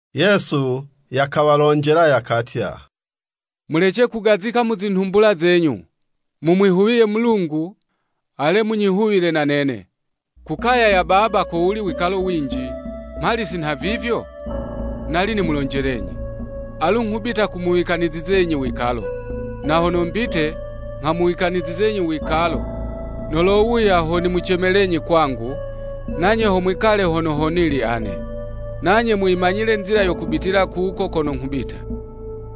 Yesu yakawalonjela, yakatya, “Mulece kugazika mu zinhumbula zenyu, Mumwihuwiye Mulungu, ale munyihuwile na nene. Ku kaya ya Baba kowuli wikalo winji, mhali si nhavivyo, nali nimulonjelenyi. Alu nghubita kumuwikanizizenyi wikalo. Na hono mbite, nghamuwikanizizenyi wikalo, nolowuya, ho nimucemelenyi kwangu, nanye ho mwikale hono ho nili ane. Nanye muyimanyile nzila yo kubitila kuko kono nghubita.”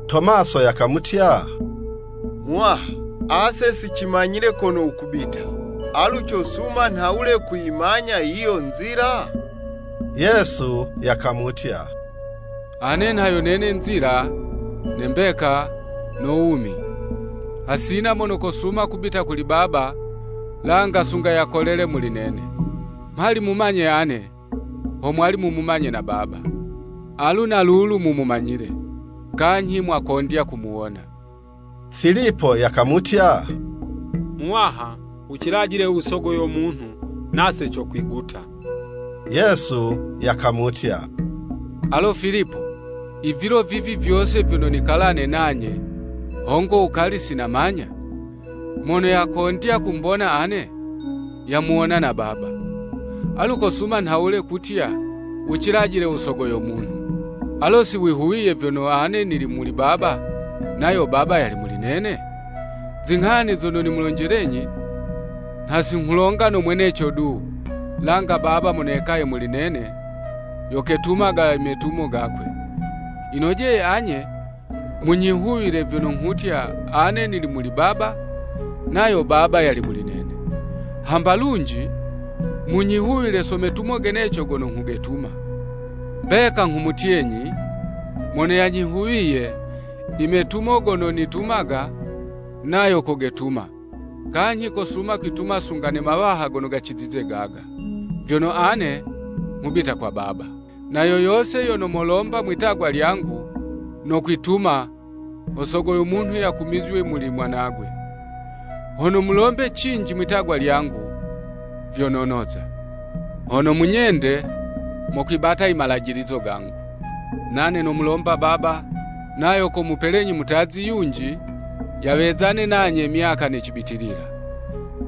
Tomaso yakamutya, “Muwaha, ase si cimanyile kono wukubita, alu cosuma nhawule kuyimanya yiyo nzila?” Yesu yakamutya, “Ane nha yo nene nzila, ne mbeka, no wumi. Hasina mono kosuma kubita kuli Baba, langa sunga yakolele muli nene. Mhali mumanye ane, ho mwali mumumanye na Baba. Alu na lulu mumumanyile, kanyhi mwakondya kumuwona.” Filipo yakamutya, “Muwaha, wucilajile u Sogo yo munhu, nase cokwiguta.” Yesu yakamutya, “Alo Filipo, i vilo vyose vivi vyono nikalane nanye, hongo wukali sinamanya? Mono yakondya kumbona ane, yamuwona na Baba. Alu kosuma nhawule kutya, ‘Wucilajile u Sogo yo Munhu.’ Alo si wihuwiye vyono ane nili muli Baba, nayo Baba yali muli nene? Zinghani zono nimulonjelenyi, nha singhulonga no mweneco du, langa Baba mono yekaye muli nene, yo ketumaga imetumo gakwe. Yinojeye anye, munyihuwile vyono nghutya ane nili muli Baba, nayo Baba yali muli nene. Hamba lunji, munyihuwile so metumo geneco gono nghugetuma. Mbeka nghumutyenyi: Mono yanyihuwiye, imetumo gono nitumaga, nayo kogetuma, kanyhi kosuma kwituma sunga ne mawaha gono gacizize gaga. Vyono ane nghubita kwa Baba. Na yo yose yono molomba mwitagwa lyangu, nokwituma, ho Sogo yo Munhu yakumizywe muli mwanagwe. Hono mulombe cinji mwitagwa lyangu, vyo nonoza. “Hono munyende, mokwibata i malajilizo gangu. Nane nomulomba Baba, nayo komupelenyi mutazi yunji, yawezane nanye myaka ne cibitilila.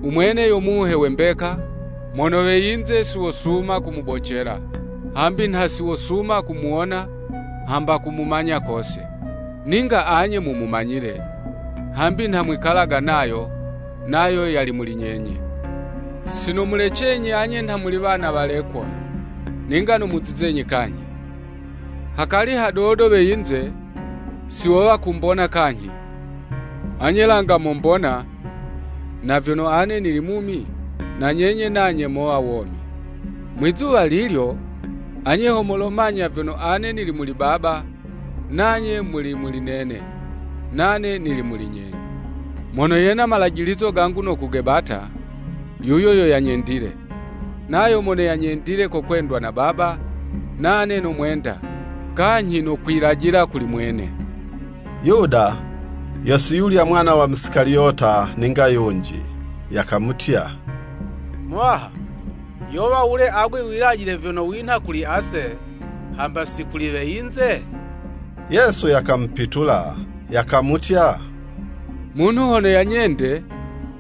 U mwene yo Muhe we mbeka, mono we yinze si wosuma kumubocela, hambi nha si wosuma kumuwona, hamba kumumanya kose. Ninga anye mumumanyile, hambi nha mwikalaga nayo, nayo yali muli nyenye. “Si nomulecenyi anye nha muli wana walekwa, ninga nomuzizenyi kanyhi. Hakali hadodo we yinze, si wowa kumbona kanyhi, anye langa mombona, na vyono ane nili mumi, na nyenye nanye mowa womi. Mwizuwa lilyo, anye ho molomanya vyono ane nili muli Baba, nanye muli muli nene, nane nili muli nyenye. Mono yena malajilizo gangu no kugebata, yuyo yo yanyendile, nayo mono yanyendile kokwendwa na Baba, nane nomwenda, kanyhi nokwilajila kuli mwene.” Yuda (yo siyulya mwana wa Musikaliyota ninga yunji) yakamutya, “Muwaha, yowa wule agwe wilajile vyono winha kuli ase, hamba si kuli we yinze?” Yesu yakamupitula, yakamutya, “Munhu hono yanyende,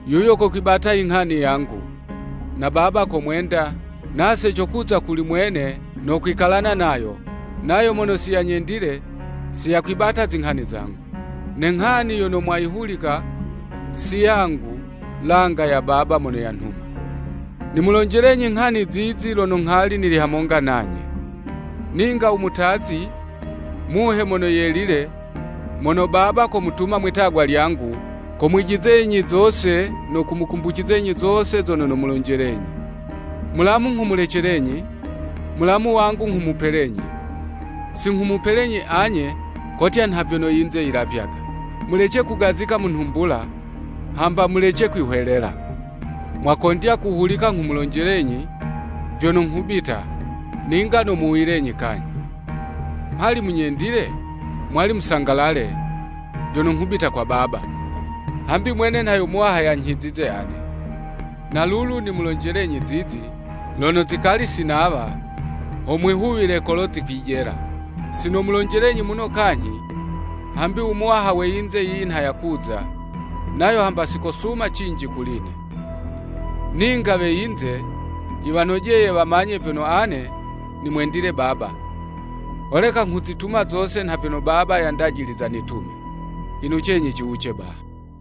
yuyo kokwibata inghani yangu, na Baba komwenda, nase cokuza kuli mwene, no kwikalana nayo. Nayo mono siyanyendile, si yakwibata zinghani zangu. Ne nghani yono mwayihulika, si yangu langa ya Baba mono yanhuma. “Nimulonjelenyi nghani zizi, lono nghali nili hamonga nanye. Ninga u mutazi, Muhe Mono Yelile, mono Baba komutuma mwitagwa lyangu, ko mwijizenyi zose no kumukumbucizenyi zose zono nomulonjelenyi. “Mulamu nghumulecelenyi, mulamu wangu nghumupelenyi, si nghumupelenyi anye kotya nha vyono yinze yilavyaga. Mulece kugazika mu nhumbula, hamba mulece kwihwelela. Mwakondya kuhulika nghumulonjelenyi, vyono, ‘Nghubita, ninga nomuwuyilenyi kanyhi.’ Mhali munyendile, mwali musangalale, vyono nghubita kwa Baba; hambi mwene nha yo Muwaha yanyhizize ane. Na lulu nimulonjelenyi zizi, lono zikali si nawa, ho mwihuwile kolo zikwijela. Si nomulonjelenyi muno kanyhi, hambi u muwaha we yinze yiyi nha yakuza, nayo hamba si kosuma cinji kuli'ne. Ninga we yinze yiwanojeye wamanye vyono ane nimwendile Baba, holeka nghuzituma zose nha vyono Baba yandajiliza nitume. Inucenyi ciwuce baha.